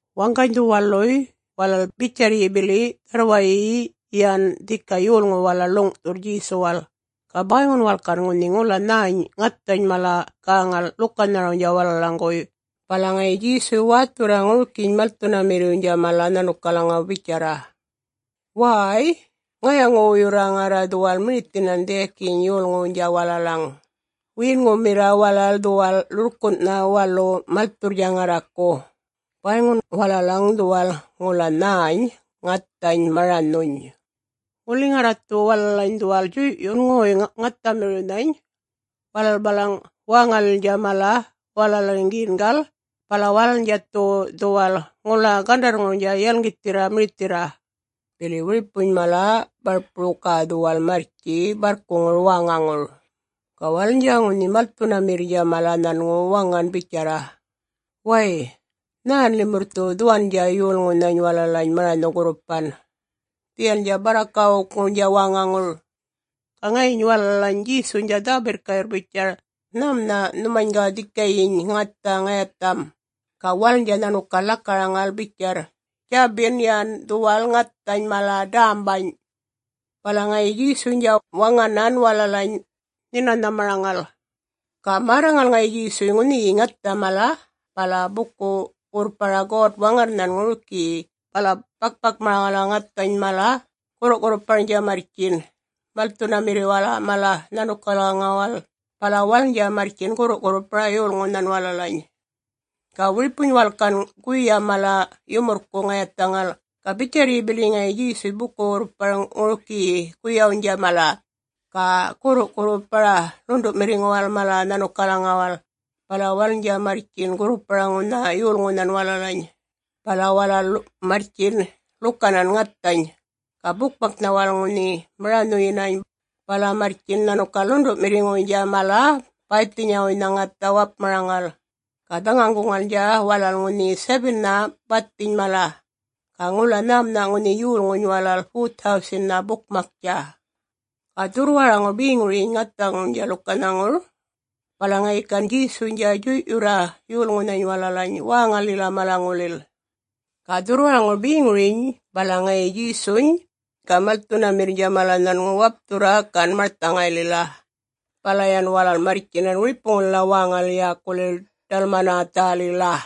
Waŋganydhuny waluy walal bitjarryi bili dharrwayi yan dhika yolŋu walal ḻuŋ'thurr Djesuwal. Ga bäyŋun walal gan ŋunhi ŋula nhäny ŋathany mala gäŋal ḻukanharawnydja walalaŋguwuy. Bala ŋayi Djesuny wäthurra ŋurikiyiny malthunamirriwnydja mala nhanukalaŋaw bitjarra, “Wäy! Ŋayaŋu-wuyurra ŋarra dhuwal mirithinan dhiyakuny yolŋuwnydja walalaŋ. Wiyinŋumirra walal dhuwal ḻurrkun'nha walu malthundja ŋarraku. Bäyŋun walalaŋ dhuwal ŋula nhäny ŋathany maranhuny. Ŋuli ŋarra dhu walalany dhuwal djuy'yundja ŋoy-ŋathamiriwnhany walalany bala wäŋalilnydja mala walalaŋgiyingal, bala walalnydja dhu dhuwal ŋula gandarrŋurnydja yalŋgithirra mirithirra, bili wiripuny mala barpuru ga dhuwal marrtji barrkuŋura wäŋaŋur.” Ga walalnydja ŋunhi malthunamirrnydja mala nhanŋu waŋan bitjarra, “Wäy, nhän limurr dhu dhuwandja yolŋunhany walalany maranhu-gurrupan, dhiyalnydja barrakawukŋurnydja wäŋaŋur?” Ga ŋayiny walalany Djesuynydja dhä-birrka'yurr bitjarr, “Nhämunha' nhumany ga dhikayiny ŋatha ŋayatham?” Ga walalnydja nhanukal lakaraŋal bitjarr, “Djabin yan dhuwal ŋathany mala dämbany.” Bala ŋayi Djesuynydja waŋanan walalany nhinanhamaraŋala. Ga märraŋal ŋayi Djesuy ŋunhiyiny ŋathany mala bala buku-wurrpara God-Waŋarrnhan ŋurikiyi, bala bak-bakmaraŋala ŋathany bala gurru'-gurruparnydja marrtjin malthunamirriwala mala nhanukalaŋuwal, bala walalnydja marrtjin gurrupar yolŋunhan walalany. Ga wiripuny walal gan guya mala yumurrku ŋayathaŋal, ga bitjarryi bili ŋayi Djesuy buku-wurrpar ŋurikiyiny guyawnydja mala, ga gurru'-gurrupar ḻundu'mirriŋuwala mala nhanukalaŋuwal, bala walalnydja marrtjin gurrupar ŋunha yolŋunhan walalany. Bala walal marrtjin ḻukanan ŋathany, ga bukmaknha walal ŋunhi maranhuyinany. Bala marrtjin nhanukal ḻundu'mirriŋuynydja mala bäythinyawuynydja ŋatha wapmaraŋala, ga dhaŋaŋguŋalnydja walal ŋunhi 7-nha bathiny mala. Ga ŋula nhämunha' ŋunhi yolŋuny walal 4,000-nha bukmaktja. Ga dhurrwaraŋur beŋuryiny ŋathaŋurnydja ḻukanhaŋur, bala ŋayi gan Djesuynydja djuy'yurra yolŋunhany walalany wäŋalila malaŋulil. Ga dhurrwaraŋur beŋuryiny bala ŋayi Djesuny ga malthunamirrnydja mala nhanŋu wapthurra gan marthaŋaylila, bala yan walal marrtjinan wiripulila wäŋalil yäkulil Dalmanathalila.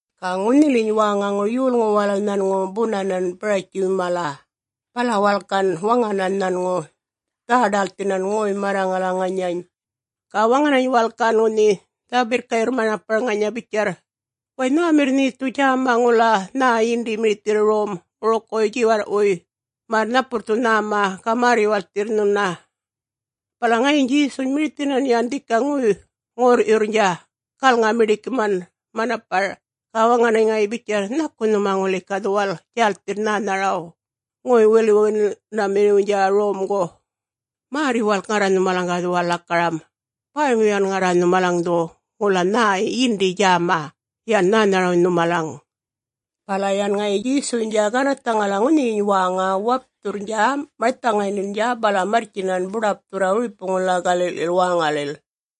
Ga ŋunhiliyiny wäŋaŋur yolŋu walal nhanŋu bunan Baratji mala, bala walal gan waŋanan nhanŋu dhä-ḏälthinan ŋoy-marraŋala ŋanya. Ga waŋanany walal gan ŋunhi birrka'yurr manapar ŋanya bitjarr, “Way nhämirr nhe dhu djäma ŋula nhä yindi mirithirr rom ŋurukuwuy djiwarr'wuy, märr napurr dhu nhäma, ga märr-yuwalkthirr nhuna.” Bala ŋayiny Djesuny mirithinan yan dhika ŋorr'yurrnydja galŋa-miḏikinan manapar, ga waŋanany ŋayi bitjarra, “Nhaku nhumany ŋuli ga dhuwal djälthirr nhänharaw, ŋoy-wilwilyunamirriwnydja romgu? Märr-yuwalk ŋarra nhumalaŋ ga dhuwal lakaramany, bäyŋu yan ŋarra nhumalaŋ dhu ŋula nhä yindi djäma yän nhänharawnydja nhumalaŋ.” Bala yan ŋayi Djesuynydja ganarrthaŋala ŋunhiyiny wäŋa, wapthurrnydja marthaŋaylilnydja, bala marrtjinan buḏapthurra wiripuŋulila gali'lil wäŋalil.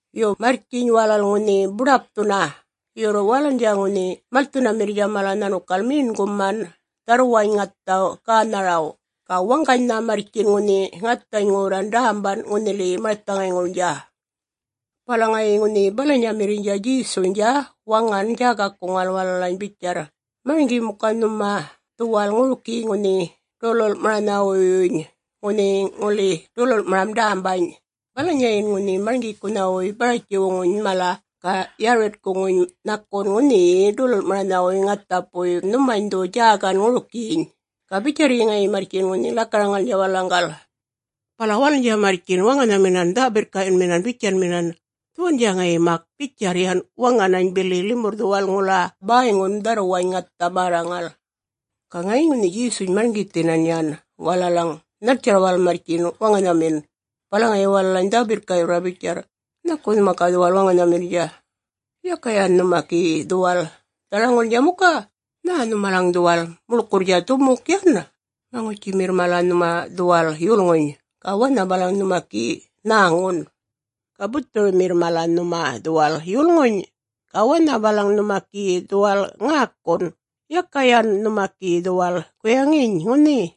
Yo, marrtjiny walal ŋunhi buḏapthunna, yurr walalnydja ŋunhi malthunamirriynydja mala nhanukal meṉguman dharrwawnydja ŋathaw gänharaw, ga waŋganynha marrtji ŋunhi ŋathany ŋorra dämban ŋunhiliyiny marthaŋayŋurnydja. Bala ŋayi ŋunhi balanyamirriynydja Djesuynydja waŋanan djägakuŋala walalany bitjarra, “Marŋgi muka nhuma dhuwal ŋurikiyiny ŋunhi ḏulul'maranhawuywuny, ŋunhi ŋuli ḏulul'maram dämbany. Balanyayin ŋunhi marŋgikunhawuy Baratjiwnydja mala ga Yaritkuny nhakun ŋunhiyi ḏulul'maranhawuy ŋathapuy, ga nhumany dhu djägan ŋurikiny.” Ga bitjarryin ŋayi marrtjin ŋunhi lakaraŋalnydja walalaŋgal. Bala walalnydja marrtjin waŋanhaminan dhä-birrka'yunminan bitjanminan, “Dhuwandja ŋayi mak bitjarrnydja waŋan bili limurr dhuwal ŋula bäyŋu dharrwany ŋatha märraŋal.” Ga ŋayiny ŋunhi Djesuny marŋgithin yan walalaŋ nhaltjarr walal marrtji waŋanhamin, bala ŋayi walalany dhä-birrka'yurra bitjarra, “Nhaku nhuma ga dhuwal waŋanhamirrnydja? Yaka yan nhuma gi dhuwal dharaŋulnydja muka? Nhä nhumalaŋ dhuwal muḻkurrnydja dhumuk yan? Maŋutjimirr mala nhuma dhuwal yulŋuny, ga wanha balaŋ nhuma gi nhäŋun. Ga buthurumirr mala nhuma dhuwal yulŋuny ga wanha balaŋ nhuma gi dhuwal ŋäkun. Yaka yan nhuma gi dhuwal guyaŋiny ŋunhi,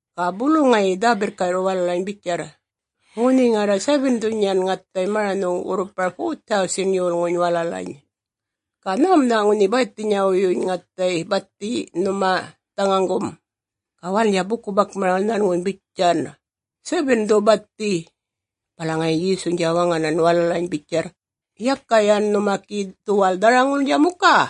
Ga bulu ŋayi dhä-birrka'yurr walalany bitjarr, “Ŋunhi ŋarra 7-dhuny yan ŋathay maranhu-wurrupan 4,000-nhany yolŋuny walalany, ga nhämunha' ŋunhi bäythinyawuyyuny ŋathay bathiny nhuma dhaŋaŋgum?” Ga walalnydja buku-bakmaram nhanŋu bitjan, “7-dhu bathiy.” Bala ŋayi Djesuynydja waŋanan walalany bitjarra, “Yaka yan nhuma gi dhuwal dharaŋulnydja muka?”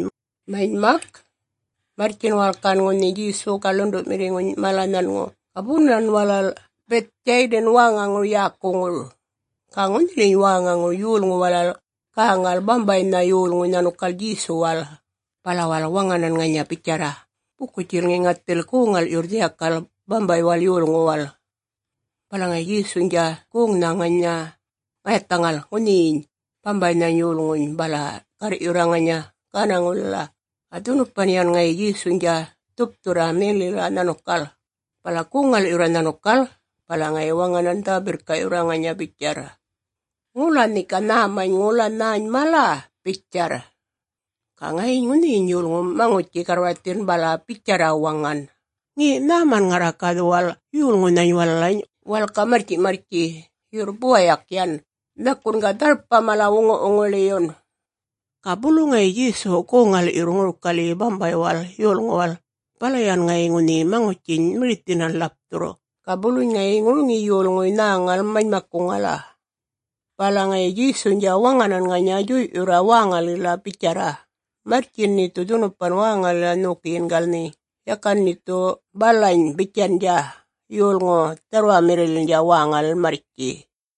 Manymak, marrtjinany walal gan ŋunhi Djesuny ga ḻundu'mirriŋuny mala nhanŋu ga bunan walal Bithdjaydan wäŋaŋur yäkuŋur. Ga ŋunhiliyiny wäŋaŋur yolŋuy walal gäŋal bambaynha yolŋuny nhanukal Djesuwal, bala walal waŋanan ŋanya bitjarra, “Buku-djulŋi ŋathil goŋ-ŋal'yurr dhiyakal bambaywal yolŋuwal.” Bala ŋayi Djesuynydja goŋnha ŋanya ŋayathaŋal ŋunhiyiny bambaynhany yolŋuny bala garr'yurra ŋanya gänaŋulila. Ga dhunupan yan ŋayi Djesuynydja dhupthurra mellila nhanukal, bala goŋ-ŋal'yurra nhanukala, bala ŋayi waŋanan dhä-birrka'yurra ŋanya bitjarra, “Ŋula nhe ga nhäma ŋula nhäny mala?” bitjarr. Ga ŋayiny ŋunhiyiny yolŋuny maŋutji-garrwarthin bala bitjarra waŋan, “Ŋe, Nhäman ŋarra ga dhuwal yolŋunhany walalany walal ga marrtji'-marrtji, yurr buwayak yan, nhakun ga dharpa mala wuŋi-wuŋiḻi'yun.” Ga bulu ŋayi Djesu goŋ-ŋal'yurr ŋurikalyi bambaywal yolŋuwal, bala yan ŋayi ŋunhi maŋutjiny mirithinan ḻapthurr, ga buluny ŋayi ŋuriŋiyi yolŋuy nhäŋal manymakkuŋala. Bala ŋayi Djesuynydja waŋanan ŋanya djuy'yurra wäŋalila bitjarra, “Marrtjiny nhe dhu dhunupan wäŋalila nhokiyingal nhe, yakan nhe dhu balany bitjandja yolŋu dharrwamirrililnydja wäŋalil marrtji.”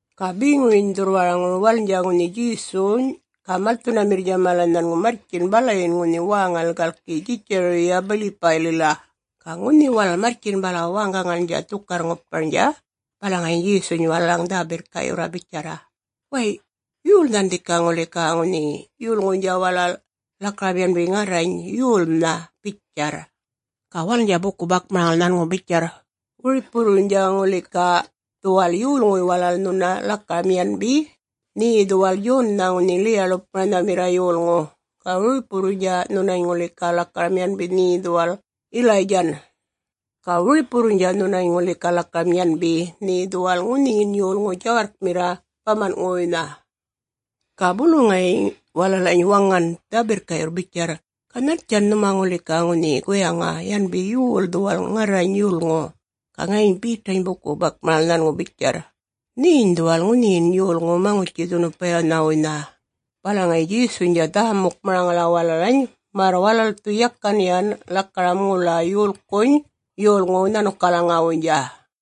Ga beŋuryiny dhurrwaraŋur walalnydja ŋunhi Djesuny ga malthunamirrnydja mala nhanŋu marrtjin balan ŋunhi wäŋalil galki Djitjariya-Bilipaylila. Ga ŋunhi walal marrtjin bala wäŋgaŋalnydja dhukarr-ŋuparnydja, bala ŋayi Djesuynydja walalany dhä-birrka'yurra bitjarra, “Wäy yolnhan dhika ŋuli ga ŋunhi yolŋuynydja walal lakaram yanbi ŋarrany yolnha?” bitjarr. Ga walalnydja buku-bakmaraŋal nhanŋu bitjarr, “Wiripuwurruynydja ŋuli ga dhuwal yolŋuy walal nhuna lakaram yanbi nhe dhuwal Djonnha ŋunhi Ḻiya-ḻupmaranhamirra yolŋu. Ga wiripuwurruy nhuna ŋuli ga lakaram yanbi nhe dhuwal Yilaydjan, ga wiripuwurruynydja nhuna ŋuli ga lakaram yanbi nhe dhuwal ŋunhin yolŋu djawarrkmirra baman'ŋuwuynha.” Ga bulu ŋayi walalany waŋan dhä-birrka'yurr bitjarra, “Ga nhaltjan nhumany ŋuli ga ŋunhi guyaŋa, yanbi yol dhuwal ŋarrany yolŋu?” Ga ŋayiny Betany buku-bakmaraŋal nhanŋu bitjarra, “Nheny dhuwal ŋunhiyin yolŋu Maŋutji-dhunupayanhawuynha.” Bala ŋayi Djesuynydja dhä-mukmaraŋala walalany märr walal dhu yakan yan lakaram ŋula yolkuny yolŋuw nhanukalaŋuwuynydja.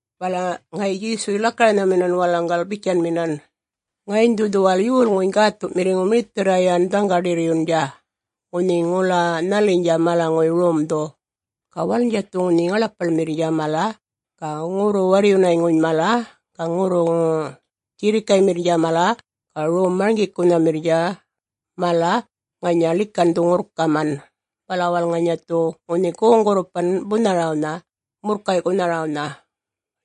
Bala ŋayi Djesuny lakaranhaminan walalaŋgal bitjanminan, “Ŋayiny dhu dhuwal Yolŋuny Gäthu'mirriŋu mirithirra yan dhaŋga-ḏirryundja ŋunhi ŋula nhaliyinydja malaŋuy romdhu. Ga walalnydja dhu ŋunhi ŋaḻapaḻmirriynydja mala ga ŋurru-warryunayŋuynydja mala ga ŋurruŋu-djirrikaymirriynydja mala ga rom-marŋgikunhamirriynydja mala ŋanya ḻikandhu-ŋurrkaman, bala walal ŋanya dhu ŋunhi goŋ-gurrupanna bunharawnha murrkay'kunharawnha.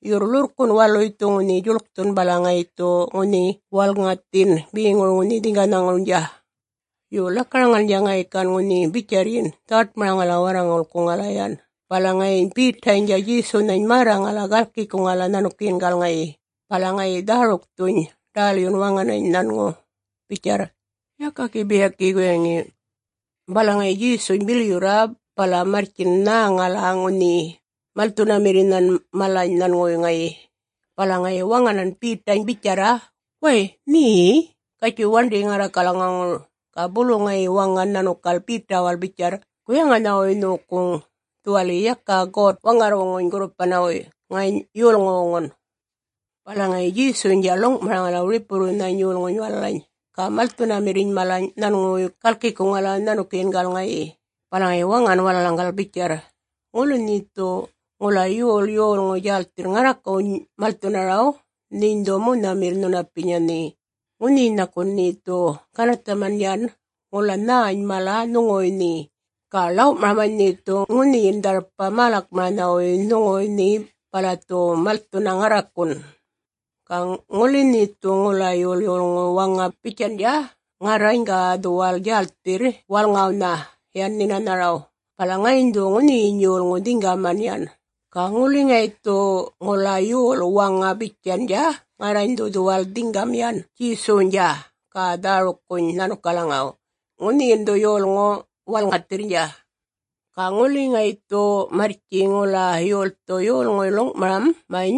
Yurr ḻurrkun' waluny dhu ŋunhi djuḻkthurr bala ŋayi dhu ŋunhi walŋathin beŋurnydja ŋunhi dhiŋganhaŋurnydja.” Yo lakaraŋalnydja ŋayi gan ŋunhi bitjarryiny dhawaṯmaraŋala warraŋulkuŋala yan. Bala ŋayiny Betaynydja Djesunhany märraŋala galkikuŋala nhanukiyingala ŋayi, bala ŋayi dhärukthuny ḏälyun waŋanany nhanŋu bitjarra, “Yaka gi biyakiyi waŋi.” Bala ŋayi Djesuny bilyurra bala marrtjin nhäŋala ŋunhi malthunamirrinhan mala nhanŋuwuy ŋayi, bala ŋayi waŋanan Betawnydja bitjarra, “Way nhe Djaytin, gatjuy waṉḏi ŋarrakalaŋaŋur.” Ga bulu ŋayi waŋan nhanukal Betawal bitjarr, “Guyaŋanhawuynydja nhokuŋ dhuwali yakan God-Waŋarrwuŋuny gurrupanawuy, ŋany yolŋuwuŋun.” Bala ŋayi Djesuynydja ḻuŋ'maraŋala wiripuwurrunhany yolŋuny walalany ga malthunamirriny mala nhanŋuwuy galkikuŋala nhanukiyingala ŋayi, bala ŋayi waŋanan walalaŋ bitjarra, “Ŋuli nhe dhu ŋula yol yolŋu djälthirr ŋarrakuny malthunaraw, nheny dhu monhamirra nhunapinya nhe. Ŋunhiyiny nhakun nhe dhu ganarrthaman yan ŋula nhäny mala nhuŋuwuy nhe, ga ḻaw'maramany nhe dhu ŋunhin dharpa mälakmaranhawuynha nhuŋuwuy nhe bala dhu malthunna ŋarrakun. Ga ŋuli nhe dhu ŋula yol waŋa bitjandja, ‘Ŋarrany ga dhuwal djälthirr walŋawnha yan nhinanharaw,’ bala ŋayiny dhu ŋunhiyiny yolŋu dhiŋgaman yan. Ga ŋuli ŋayi dhu ŋula yol waŋa bitjandja, ‘Ŋarrany dhu dhuwal dhiŋgam yan Djesuwnydja ga dhärukkuny nhanukalaŋaw,’ ŋunhiyin dhu ŋunhi yolŋu walŋathirrnydja. Ga ŋuli ŋayi dhu marrtji ŋula yolthu yolŋuy ḻuŋ'maramany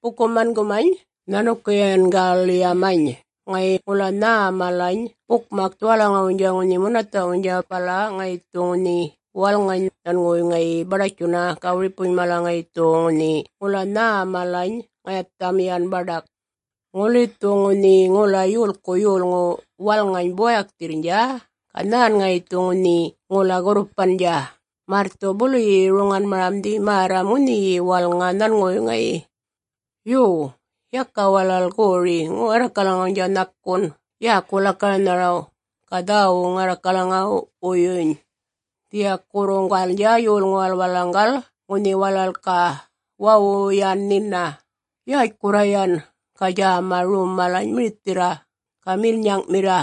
buku-mangumany nhanukiyingallilyamany ŋayi ŋula nhä malany bukmak dhuwalaŋuwuynydja ŋunhi munatha'wuynydja, bala ŋayi dhu ŋunhi walŋany nhanŋuwuy ŋayi baḏatjunna, ga wiripuny mala ŋayi dhu ga ŋunhi ŋula nhä malany ŋayatham yan baḏak? Ŋuli dhu ŋunhi ŋula yolku yolŋuw walŋa buwayakthirrnydja, ga nhän ŋayi dhu ŋunhi ŋula gurrupandja, märr ŋayi dhu buluyi roŋanmaramdhi märram ŋunhiyi walŋany nhanŋuwuy ŋayi. Yo, yakan walal goriny ŋarrakalnydja nhakun yäku-lakaranharay, ga dhäwuy ŋarrakalaŋawuyyuny, dhiyakurruwurruŋgalnydja yolŋuwal walalaŋgal ŋunhi walal ga wawu yan nhina, yätjkurra yan ga djäma rom malany mirithirra ga milnyaŋ'mirra.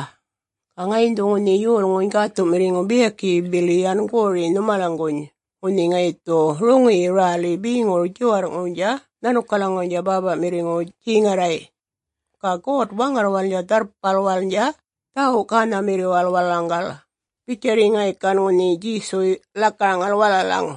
Ga ŋayiny dhu ŋunhi Yolŋuny Gäthu'mirriŋu biyakiyi bili yan gori nhumalaŋguny ŋunhi ŋayi dhu roŋiyiny räliny beŋurnydja djiwarr'ŋurnydja nhanukalaŋuwalnydja Bäpa'mirriŋuwal djeŋarray', ga God-Waŋarrwalnydja dharrpalwalnydja dhäwu-gänhamirriwal walalaŋgal,” bitjarra ŋayi gan ŋunhi Djesuy lakaraŋalnydja walalaŋ.